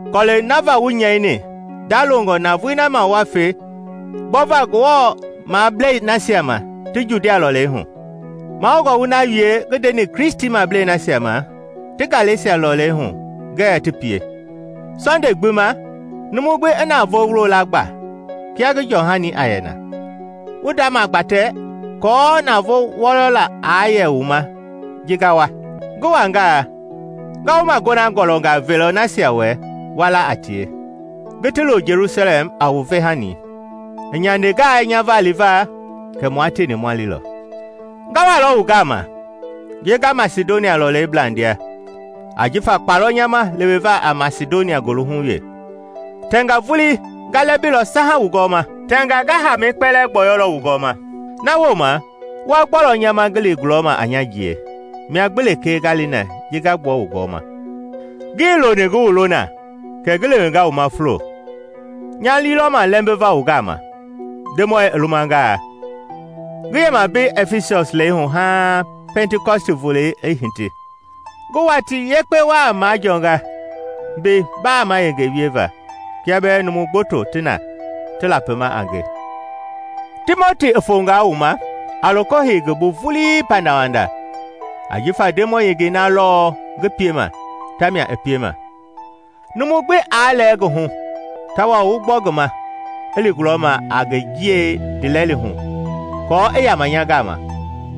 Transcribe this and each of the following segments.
Kɔlɛi na va wu nyɛini ndalongɔ navoei na ma ma fe gbɔva Ngewɔmablei nasia ma ti Judia lɔlei hu. Mahoungɔ wu na wie ngi ndeni Kristimablei nasia ma ti Galesia lɔlei hu ngɛɛ ti pie. Sɔnde gbi ma, numu gbi i navoo la gba kia ngi jɔhani a yɛ na, wu ndamagbatɛ aako navoo wɔyɔla aa yɛ wu ma ji nga wa. Ngi wangaa, nga wu magona gɔlɔngaa velɔ nasia wɛ wa la a tie, ngi ti lo Jelusalɛm a wu vehani. I nyandengaa nya va livaa, kɛ mua tieni ma lilɔ. Nga walɔ wu gama ji nga Masidonia lɔlei blandia ajifa kpa lɔ nya ma leweva a Masidonia goohu wee. Tɛnga vuli nga lɛmbilɔ saha wu gɔɔma, tɛngaa nga haamɛi kpɛlɛɛ gbɔyɔlɔ wu gɔɔma, na wooma wa gbɔlɔ nya ma ngi li gulɔma a nya jiei, mia gbi lekee nga li na ji nga gbua wu gɔɔma. Ngii loni ngi wu lɔ na kɛ ngi lewenga wu ma fulo; nya lii lɔ ma lɛmbiva wu gama, Ndemɔi i lumangaa. Ngi yɛmaa mbei Ɛfisɔs lɛi hu haaŋ Pɛntikɔsti volei i hiti. Ngi watii yekpe waa majɔɔnga mbei baama yenge wieva kia bɛɛ numu gboto ti na ti lapima a nge. Timoti i fonga wu ma, a loko hei ngi bu vulii pandawanda ajifa Ndemɔi yengei na lɔɔ ngi piema tamia i piema. Numu gbi aa lɛɛ ngi hu tawao wu gbɔ ngi ma i li gulɔma a ngi jiei ndiilɛli hu aako i yama nya gama;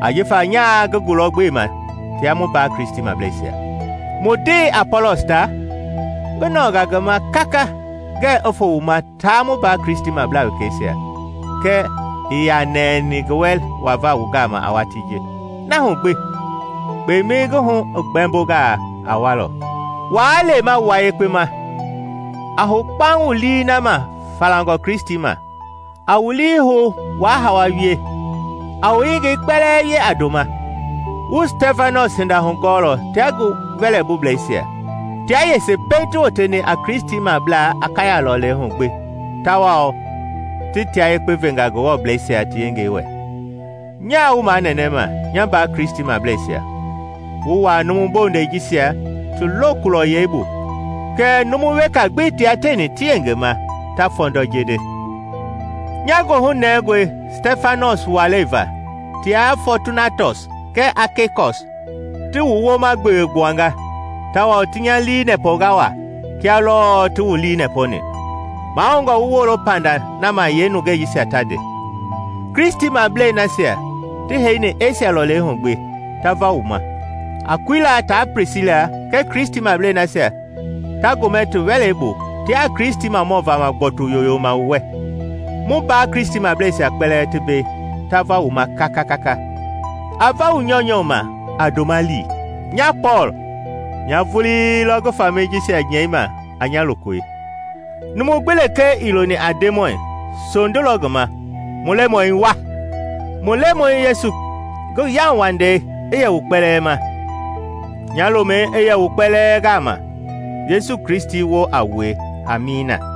ajifa nyaa ngi gulɔ gbema tia mu mbaa Kristimableisia. Mu ndee Apɔlɔs ta, ngi nɔɔnga ngi ma kaka ngɛɛ i foo wu ma taa mu mbaa Kristimablaa wekeisia, kɛɛ ii yaa nɛni ngi wɛ wava wu gama a watii ji. Na hu gbi, kpemɛi ngi hu i gbɛmbongaa, a walɔ. Waa lema wua yekpe ma, a hou kpaŋ wu lii na ma falangɔ Kristi ma, a wu lii hou waa hawa wie. A wu yengei kpɛlɛɛ wie a ndoma. Wu Stɛfanɔs hinda hugɔɔlɔ tia ngi wɛlɛbuleisia; tia yese pɛiŋ ti woteni a Kristimablaa Akaya lɔlei hu gbi tawao ti tia yekpe venga Ngewɔmableisia ti yengei wɛ. Nyaa wu manɛnɛma, nya mbaa Kristimableisia, wu wuaa numu bondɛi jisia ti lokulɔyɛi bu kɛɛ numu weka gbi tia tieni ti yengema ta fɔndɔ jeende. Nya goohu nɛngɔe Stɛfanɔs walei va tia Fɔɔtunatɔs kɛɛ Akeikɔs; ti wu wooma gbewe gbuanga tawao ti nya lii nɛpɔnga waa kia lɔɔ ti wu lii nɛpɔni. Mahoungɔ wu wolo panda nama yee nungei jisia ta nde. Kristimablei nasia ti heiheini Esia lɔlei hu gbi ta va wu ma. Akuila taa Plisila kɛɛ Kristimablei nasia ta gomɛ ti wɛlei bu tiaa Kristimamɔ-vama gbɔtu yoyoma wu wɛ. Mu mbaa Kristimableisia kpɛlɛɛ ti mbei ta va wu ma kaka. A va wu nyɔunyɔ ma a ndoma lii. Nya Pɔɔl, nya vulii lɔ ngi famɛi jisia nyɛima a nya lokoi. Numu gbi lekee ii loni a Ndemɔi, sondu lɔ ngi ma! Mu Lemɔi, wa! Mu Lemɔi Yesu ngi yauwandei i yɛ wu kpɛlɛɛ ma. Nya lomɛi i yɛ wu kpɛlɛɛ gama Yesu Kristi woo a wue. Amiina.